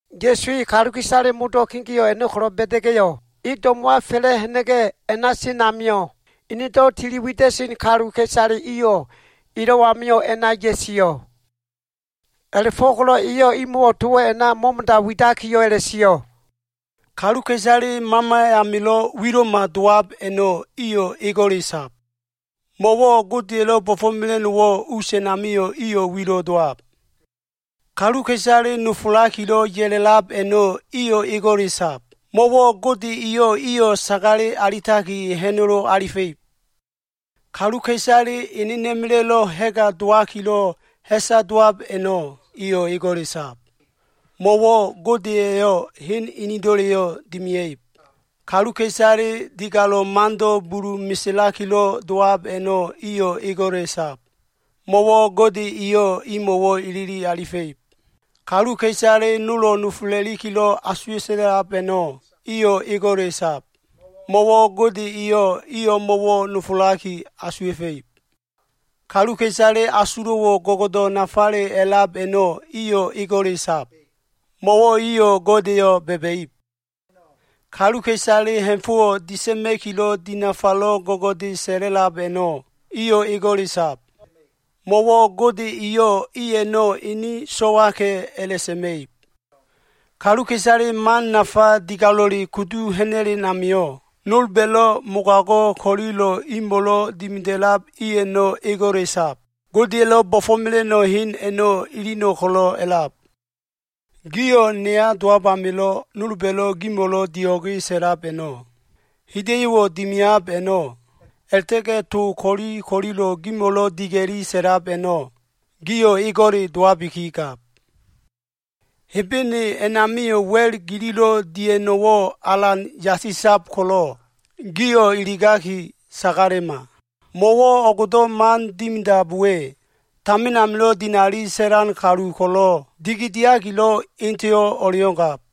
Ya꞉su e kaluka꞉isale modo꞉ kegeo꞉ a꞉no꞉ ko꞉lo꞉ ba꞉da꞉ga꞉yo꞉, e do꞉mo꞉wa fa꞉la꞉ ha꞉na꞉ga꞉, a꞉na sen amio꞉, enedo꞉ tili wida꞉sen kaluka꞉isale iyo꞉ elo꞉ amio꞉ a꞉na ya꞉sio꞉. A꞉la꞉fo꞉ko꞉lo꞉ eyo꞉ imo꞉wo꞉ towo꞉ a꞉na mo꞉mo꞉da widakiyo꞉ a꞉la꞉sio꞉. “Kaluka꞉isale mama amilo꞉ wilo꞉ma dowab a꞉no꞉ iyo꞉ ego꞉le sab. Mo꞉wo꞉ Godeya꞉lo꞉ bo꞉fo꞉mela꞉no꞉wo꞉ us a꞉namio꞉ iyo꞉ wilo꞉ dowab. Kaluka꞉isale nofolakilo꞉ ya꞉la꞉lab a꞉no꞉, iyo꞉ ego꞉le sab. Mo꞉wo꞉ Gode eyo꞉ iyo꞉ sagale alitaki, ha꞉nolo alifa꞉ib. Kaluka꞉isale enena꞉ma꞉la꞉lo꞉ ha꞉ga dowakilo꞉, ha꞉sa dowab a꞉no꞉, iyo꞉ ego꞉le sab. Mo꞉wo꞉ Gode eyo꞉ hen inido꞉leyo꞉ dimia꞉ib. Kaluka꞉isale digalo꞉ mando꞉ bulu meselakilo꞉ dowab a꞉no꞉, iyo꞉ ego꞉le sab. Mo꞉wo꞉ Gode eyo꞉ imo꞉wo꞉ ilili alifa꞉ib. Kaluka꞉isale nolo꞉ nofola꞉likilo꞉ asuwa꞉ta꞉lab a꞉no꞉, iyo꞉ ego꞉le sab. Mo꞉wo꞉ Gode eyo꞉ i o꞉mo꞉wo꞉ nofolaki asuwa꞉fa꞉ib. Kaluka꞉isale asulo꞉wo꞉ go꞉go꞉do꞉ nafale a꞉lab a꞉no꞉, iyo꞉ ego꞉le sab. Mo꞉wo꞉ iyo꞉ Godeyo꞉ ba꞉ba꞉ib. Kaluka꞉isale ha꞉fo꞉ disa꞉ma꞉kilo꞉ dinafalo꞉ go꞉go꞉de sa꞉la꞉lab a꞉no꞉, iyo꞉ ego꞉le sab. Mo꞉wo꞉ Gode eyo꞉ i a꞉no꞉ ene so꞉waka꞉ a꞉la꞉sa꞉ma꞉ib. Kaluka꞉isale man nafa digalo꞉le kudu ha꞉na꞉len amio꞉, nolba꞉yo꞉ mogago꞉ ko꞉lilo꞉ imo꞉lo꞉ dimida꞉lab i a꞉no꞉ ego꞉le sab. Godeya꞉lo꞉ bo꞉fo꞉mela꞉no꞉ hen a꞉no꞉ ilino꞉ kolo꞉ a꞉lab. “Gio꞉ neya dowab amilo꞉ nolba꞉lo꞉ gimo꞉lo꞉ dio꞉ge sa꞉lab a꞉no꞉, hida꞉yo꞉wo꞉ dimiab a꞉no꞉, a꞉la꞉ta꞉ga꞉ to ko꞉li ko꞉lilo꞉ gimo꞉lo꞉ diga꞉li sa꞉lab a꞉no꞉, gio꞉ ego꞉le dowabikigab. Hebene a꞉namio꞉ wa꞉l gililo꞉ dia꞉no꞉wo꞉ alan yasisab ko꞉lo꞉, gio꞉ iligi sagalema. Mo꞉wo꞉ o꞉go꞉do꞉ man dimidab we, tamin amilo꞉ dinali sa꞉lan kalu ko꞉lo꞉ dikidiakilo꞉ eteyo꞉ o꞉le o꞉ngab.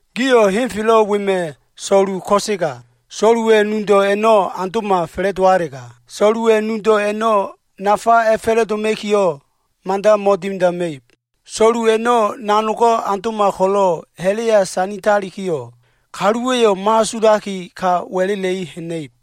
“Gio꞉ henfelo꞉ wema꞉ so꞉lu ko꞉sega, so꞉luwa꞉ nudo꞉ a꞉no꞉ aundo꞉ma fa꞉la꞉dowalega, so꞉luwa꞉ nudo꞉ a꞉no꞉ nafa a꞉fa꞉la꞉doma꞉kiyo꞉, mada mo꞉dimidama꞉ib. So꞉lu a꞉no꞉ nanogo꞉ aundo꞉ma ko꞉lo꞉, ha꞉la꞉ya sanditalikiyo꞉, kaluwa꞉yo꞉ mo꞉asulaki, ka wa꞉la꞉la꞉i ha꞉na꞉ib.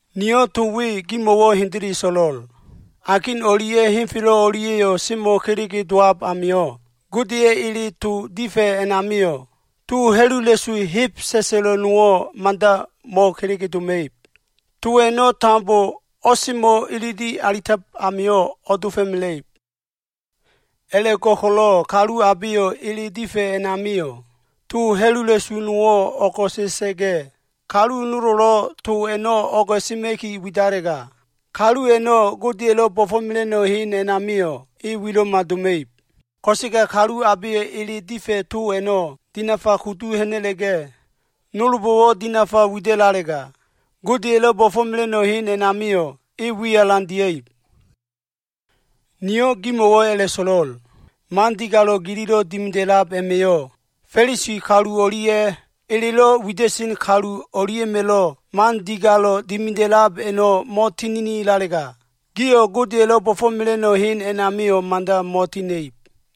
Niyo꞉ to we gimo꞉wo꞉ hendele so꞉lo꞉l. Akin o꞉lia꞉ henfelo꞉ o꞉lia꞉yo꞉ semo꞉ kelege dowab amio꞉, Godeya꞉ ele to difa꞉ a꞉namio꞉ to ha꞉lula꞉su heb sa꞉sa꞉lo꞉ nowo꞉ mada mo꞉kelege doma꞉ib. To a꞉no꞉ tambo o꞉semo꞉ ilili alitab amio꞉ o꞉dofo꞉mela꞉ib. A꞉la꞉go꞉ko꞉lo꞉ kalu abeyo꞉ ele difa꞉ a꞉namio꞉ to ha꞉lula꞉su nowo꞉ o꞉go꞉sa꞉sa꞉ga꞉, kalu nolo꞉lo꞉ to a꞉no꞉ o꞉go꞉sema꞉ki widalega, kalu a꞉no꞉ Godeya꞉lo꞉ bo꞉fo꞉mela꞉no꞉ hen a꞉namio꞉ e wilo꞉ma doma꞉ib. Ko꞉sega kalu abeyo꞉ ele to difa꞉ a꞉no꞉ dinafa kudu ha꞉na꞉ga꞉, nolbo꞉wo꞉ dinafa wida꞉lalega, Godeya꞉lo꞉ bo꞉fo꞉mela꞉no꞉ hen a꞉namio꞉ e wi alan dia꞉ib. Niyo꞉ gimo꞉wo꞉ a꞉la꞉so꞉lo꞉l. Man digalo꞉ gililo꞉ dimida꞉lab a꞉ma꞉yo꞉, Fa꞉lisi kalu o꞉lia꞉ elelo꞉ wida꞉sen kalu o꞉lia꞉ma꞉lo꞉ man digalo꞉ dimida꞉lab a꞉no꞉ mo꞉tininilalega, gio꞉ Godeya꞉lo꞉ bo꞉fo꞉mela꞉no꞉ hen a꞉namio꞉ mada mo꞉tiha꞉na꞉ib.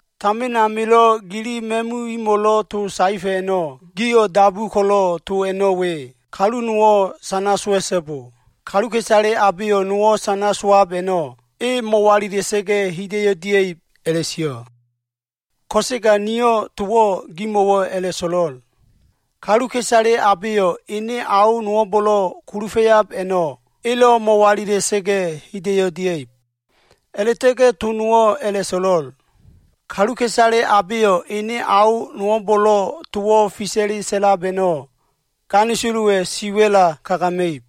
“Tamin amilo꞉ gili ma꞉mumo꞉lo꞉ to saefa꞉ a꞉no꞉ gio꞉ dabu ko꞉lo꞉ to a꞉no꞉ we, ‘Kalu nowo꞉ sana sowa꞉so꞉bo. Kaluka꞉isale abeyo꞉ nowo꞉ sana sowab a꞉no꞉, e mo꞉walila꞉sa꞉ga꞉ hida꞉yo꞉ dia꞉ib’ a꞉la꞉sio꞉. Ko꞉sega niyo꞉ towo꞉ gimo꞉wo꞉ a꞉la꞉so꞉lo꞉l. Kaluka꞉isale abeyo꞉ ene ao nowo꞉mbo꞉lo꞉ kulufa꞉yab a꞉no꞉ elo꞉ mo꞉walila꞉sa꞉ga꞉ hida꞉yo꞉ dia꞉ib. A꞉la꞉ta꞉ga꞉ to nowo꞉ a꞉la꞉so꞉lo꞉l. Kaluka꞉isale abeyo꞉ ene ao nowo꞉mbo꞉lo꞉ towo꞉ fisa꞉le sa꞉lab a꞉no꞉, ganisolowa꞉ siwa꞉la kagama꞉ib.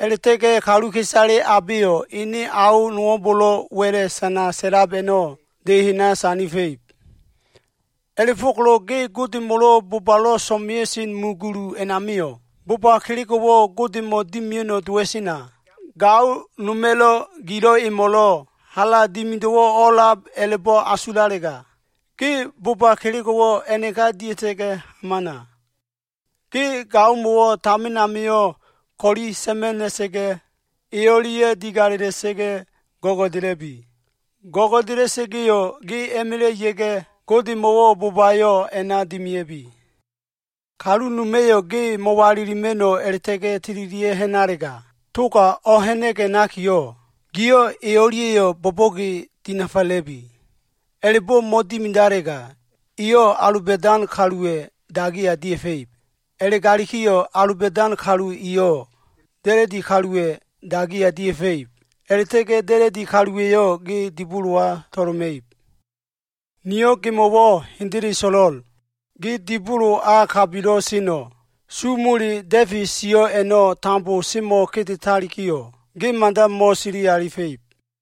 A꞉la꞉ta꞉ga꞉ kaluka꞉isale abeyo꞉ ene ao nowo꞉mbo꞉lo꞉ wa꞉la꞉ sana sa꞉lab a꞉no꞉ de hena sandifa꞉ib. “A꞉la꞉fo꞉ko꞉lo꞉ ge Godemo꞉lo꞉ bobalo꞉ so꞉mea꞉sen mu gulu a꞉namio꞉ boba kelego꞉wo꞉ Godemo꞉ dimia꞉no꞉ dowa꞉sena, gao noma꞉lo꞉ gilo꞉ emo꞉lo꞉ hala dimido꞉wo꞉ o꞉a꞉la꞉b a꞉la꞉bo꞉ asulalega, ge boba kelego꞉wo꞉ a꞉naka dia꞉ta꞉ga꞉ hamana. Ge gaomo꞉wo꞉ tamin amio꞉ o꞉ko꞉le sa꞉ma꞉ ha꞉na꞉sa꞉ga꞉, e o꞉lia꞉ digalela꞉sa꞉ga꞉ go꞉go꞉dela꞉bi. Go꞉go꞉dela꞉sa꞉ga꞉yo꞉, ge a꞉ma꞉la꞉ ya꞉ga꞉ Godemo꞉wo꞉ bobayo꞉ a꞉na dimea꞉bi. Kalu noma꞉yo꞉ ge mo꞉walilima꞉no꞉ a꞉la꞉ta꞉ga꞉ tililia꞉ ha꞉nalega, toga o꞉ha꞉na꞉ga꞉ ha꞉nakiyo꞉, giyo꞉ e o꞉lia꞉yo꞉ bo꞉bo꞉ge dinafala꞉bi. A꞉la꞉bo꞉ mo꞉dimidalega eyo꞉ aloba꞉dan kaluwa꞉ dagiya dia꞉fa꞉ib. A꞉la꞉galikiyo꞉, aloba꞉dan kalu eyo꞉ da꞉la꞉di kaluwa꞉ dagiya dia꞉fa꞉ib. A꞉la꞉ta꞉ga꞉ da꞉la꞉di kaluwa꞉yo꞉ ge dibolowa to꞉loma꞉ib. Niyo꞉ gemo꞉wo꞉ hendele so꞉lo꞉l. Ge dibolo a kabilo꞉ seno꞉, su mole da꞉fe sio꞉ a꞉no꞉ tambo semo꞉ kedetalikiyo꞉, ge mada mo꞉sili alifa꞉ib.”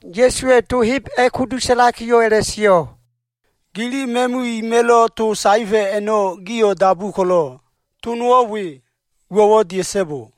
Ya꞉suwa꞉ to heb a꞉kudu sa꞉lakiyo꞉ a꞉la꞉sio꞉, “Gili ma꞉mu ima꞉lo꞉ to saefa꞉ a꞉no꞉ gio꞉ dabu ko꞉lo꞉, to nowo꞉ we, ‘Uwo꞉wo꞉ dia꞉so꞉bo.’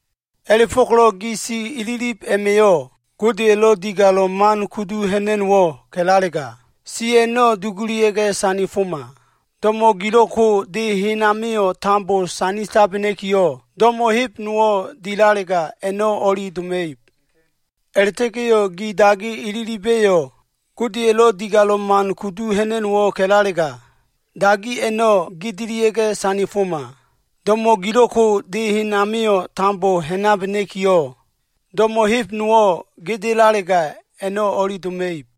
A꞉la꞉fo꞉ko꞉lo꞉ gi si ililib a꞉ma꞉yo꞉, Godeya꞉ digalo꞉ man kudu ha꞉na꞉no꞉wo꞉ ka꞉lalega, si a꞉no꞉ dugulia꞉ga꞉ sandifoma. Do꞉mo꞉ gilo꞉ ko꞉ de hen amio꞉ tambo sanditabena꞉kiyo꞉, do꞉mo꞉ heb nowo꞉ dilalega a꞉no꞉ o꞉li doma꞉ib. A꞉la꞉ta꞉ga꞉ gi dagi ililiba꞉yo꞉ Godeya꞉ digalo꞉ man kudu ha꞉na꞉no꞉wo꞉ ka꞉lalega, dagi a꞉no꞉ gedelia꞉ga꞉ sandifoma. Do꞉mo꞉ gilo꞉ ko de hen amio꞉ tambo ha꞉nabena꞉kiyo꞉, do꞉mo꞉ heb nowo꞉ gedelalega, a꞉no꞉ o꞉li doma꞉ib.”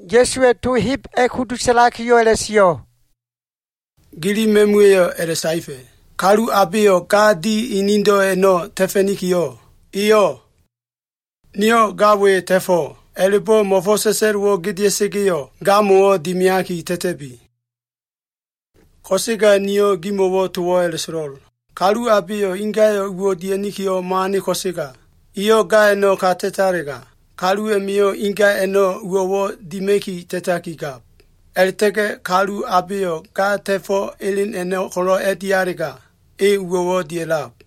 Ya꞉suwa꞉ to heb a꞉kudu sa꞉lakiyo꞉ a꞉la꞉sio꞉, “Gili ma꞉muwa꞉yo꞉ a꞉la꞉saefa꞉, ‘Kalu abeyo꞉ ga di enedo꞉ a꞉no꞉ ta꞉fa꞉nikiyo꞉, eyo꞉ “Niyo꞉ ga we ta꞉fo꞉” a꞉la꞉bo꞉ mo꞉fo꞉s sa꞉sa꞉lo꞉wo꞉ gedea꞉sa꞉ga꞉yo꞉, gamo꞉wo꞉ dimiaki ta꞉ta꞉bi.’ Ko꞉sega niyo꞉ gimo꞉wo꞉ towo꞉ a꞉la꞉so꞉lo꞉l. Kalu abeyo꞉ ingayo꞉ uwo꞉ dia꞉nikiyo꞉ mo꞉ane ko꞉sega, eyo꞉ ga a꞉no꞉ ka ta꞉talega, kalu a꞉ma꞉yo꞉ inga a꞉no꞉ uwo꞉wo꞉ dima꞉ki ta꞉takigab. A꞉la꞉ta꞉ga꞉ kalu abeyo꞉ ga ta꞉fo꞉ elen a꞉no꞉ ko꞉lo꞉ a꞉dialega, e uwo꞉ dia꞉lab.”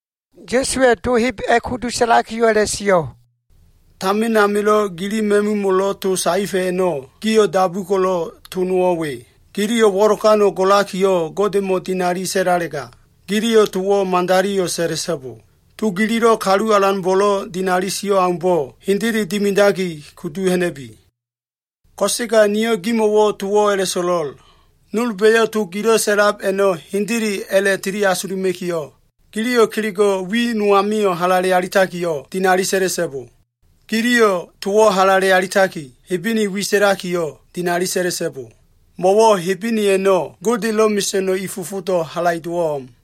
Ya꞉suwa꞉ to heb a꞉kudu sa꞉lakiyo꞉ a꞉la꞉sio꞉. “Tamin amilo꞉ gili ma꞉mumo꞉lo꞉ to saefa꞉ a꞉no꞉ gio꞉ dabu ko꞉lo꞉ to nowo꞉ we. ‘Giliyo꞉ wo꞉lokano꞉ golakiyo꞉, Godemo꞉ dinali sa꞉lalega, giliyo꞉ towo꞉ madaliyo꞉ sa꞉la꞉so꞉bo. To gililo꞉ Kalu Alanbo꞉lo꞉ dinali sio꞉ aumbo꞉ hendele dimidaki kudu ha꞉na꞉bi.’ Ko꞉sega niyo꞉ gimo꞉wo꞉ towo꞉ a꞉la꞉so꞉lo꞉l. Nolba꞉yo꞉ to gilo꞉ sa꞉lab a꞉no꞉ hendele a꞉la꞉tili asuluma꞉kiyo꞉, giliyo꞉ kelego꞉ wi no amio꞉ halale alitakiyo꞉, dinali sa꞉la꞉so꞉bo. Giliyo꞉ towo꞉ halale alitaki Hebene wi sa꞉lakiyo꞉, dinali sa꞉la꞉so꞉bo. Mo꞉wo꞉ Hebene a꞉no꞉ Godelo꞉ mesa꞉no꞉ i fofodo꞉ halaido꞉wo꞉ o꞉m.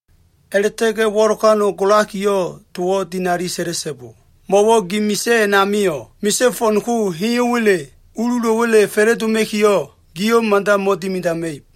A꞉la꞉ta꞉ga꞉ wo꞉lokano꞉ golakiyo꞉ towo꞉ dinali sa꞉la꞉so꞉bo. Mo꞉wo꞉ gi misa꞉ a꞉namio꞉, misa꞉ fo꞉n ko heyo꞉wa꞉le ululo꞉wa꞉le fa꞉la꞉doma꞉kiyo꞉ giyo꞉ mada mo꞉dimidama꞉ib.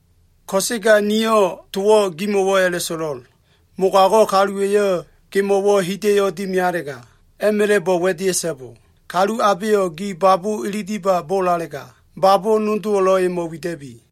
Ko꞉sega niyo꞉ towo꞉ gimo꞉wo꞉ a꞉la꞉so꞉lo꞉l. Mogago꞉ kaluwa꞉yo꞉ gemo꞉wo꞉ hida꞉yo꞉ dimialega, a꞉ma꞉la꞉bo꞉ wa꞉dea꞉so꞉bo. Kalu abeyo꞉ gi babo꞉ ililiba bolalega, babo꞉ nodowo꞉lo꞉ emo꞉ wida꞉bi.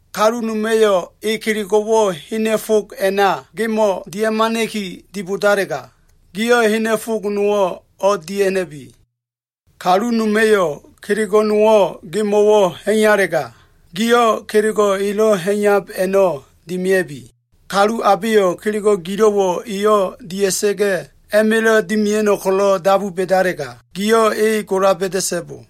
Kalu noma꞉yo꞉ e kelego꞉wo꞉ hena꞉ fog a꞉na gemo꞉ dia꞉hamana꞉ki dibodalega, giyo꞉ hena꞉ fog nowo꞉ o꞉dia꞉ha꞉na꞉bi. Kalu noma꞉yo꞉ kelego꞉ no꞉wo꞉ gemo꞉wo꞉ ha꞉iyalega, giyo꞉ kelego꞉ elo꞉ ha꞉iyab a꞉no꞉ dimea꞉bi. Kalu abeyo꞉ kelego꞉ gilo꞉wo꞉ eyo꞉ dia꞉sa꞉ga꞉ a꞉ma꞉la꞉ dimia꞉no꞉ ko꞉lo꞉ dabu ba꞉dalega, giyo꞉ e gola ba꞉da꞉so꞉bo.”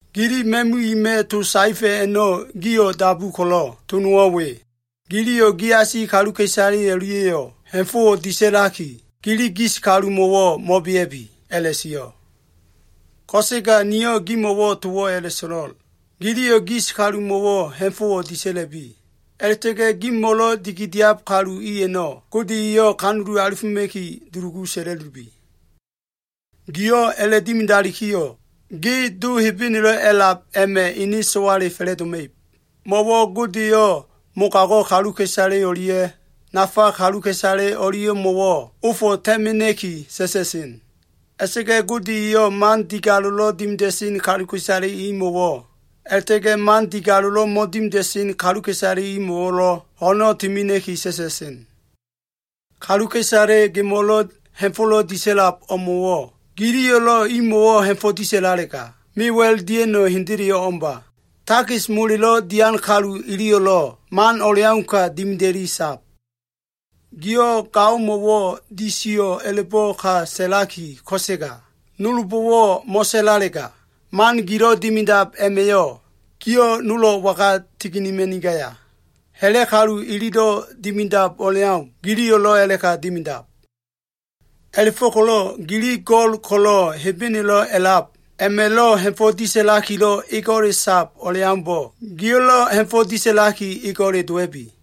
“Gili ma꞉mu ima꞉ to saefa꞉ a꞉no꞉ gio꞉ dabu ko꞉lo꞉ to nowo꞉ we. ‘Giliyo꞉ giasi kaluka꞉isale o꞉lia꞉yo꞉ ha꞉fo꞉wo꞉ disa꞉laki, gili gis kalumo꞉wo꞉ mo꞉bea꞉bi’ a꞉la꞉sio꞉. Ko꞉sega niyo꞉ gimo꞉wo꞉ towo꞉ a꞉la꞉so꞉lo꞉l. Giliyo꞉ gis kalumo꞉wo꞉ ha꞉fo꞉wo꞉ disa꞉la꞉bi. A꞉la꞉ta꞉ga꞉ gimo꞉lo꞉ dikidiab kalu i a꞉no꞉ Gode eyo꞉ kanulu alifoma꞉ki dulugu sa꞉la꞉lubi. Giyo꞉ a꞉la꞉dimidalikiyo꞉, gio꞉ Do Hebenelo꞉ a꞉lab a꞉ma꞉ ene so꞉wale fa꞉la꞉doma꞉ib. Mo꞉wo꞉ Gode eyo꞉ mogago꞉ kaluka꞉isale o꞉lia꞉ nafa kaluka꞉isale o꞉lia꞉mo꞉wo꞉ ofo꞉ ta꞉mena꞉ki ta꞉ta꞉sen. A꞉la꞉ta꞉ga꞉ Gode eyo꞉ man digalo꞉lo꞉ dimida꞉sen kaluka꞉isale imo꞉wo꞉ a꞉la꞉ta꞉ga꞉ man digalo꞉lo꞉ mo꞉dimida꞉sen kaluka꞉isalemo꞉wo꞉lo꞉ ho꞉no꞉ timena꞉ki ta꞉ta꞉sen. Kaluka꞉isale gimo꞉lo꞉ ha꞉fo꞉lo꞉ disa꞉lab o꞉mo꞉wo꞉ giliyo꞉lo꞉ imo꞉wo꞉ ha꞉fo꞉ disa꞉lalega, mewa꞉l dia꞉no꞉ hendeleyo꞉ o꞉mba. Takis molelo꞉ dian kalu iliyo꞉lo꞉ man o꞉leauka dimida꞉li sab. Gio꞉ gaomo꞉wo꞉ disiyo꞉ a꞉la꞉bo꞉ ka sa꞉laki, ko꞉sega nolbo꞉wo꞉ mo꞉sa꞉lalega, man gilo꞉ dimidab a꞉ma꞉yo꞉, gio꞉ nolo꞉ waga tininima꞉nigaya? Ha꞉la꞉ kalu ililo꞉ dimidab o꞉leau giliyo꞉lo꞉ a꞉la꞉ka dimidab. A꞉la꞉fo꞉ko꞉lo꞉ gili Go꞉l ko꞉lo꞉ Hebenelo꞉ a꞉lab a꞉ma꞉lo꞉ ha꞉fo꞉ disa꞉lakilo꞉ ego꞉le sab o꞉leaumbo꞉, gio꞉lo꞉ ha꞉fo꞉ disa꞉laki, ego꞉le dowa꞉bi.”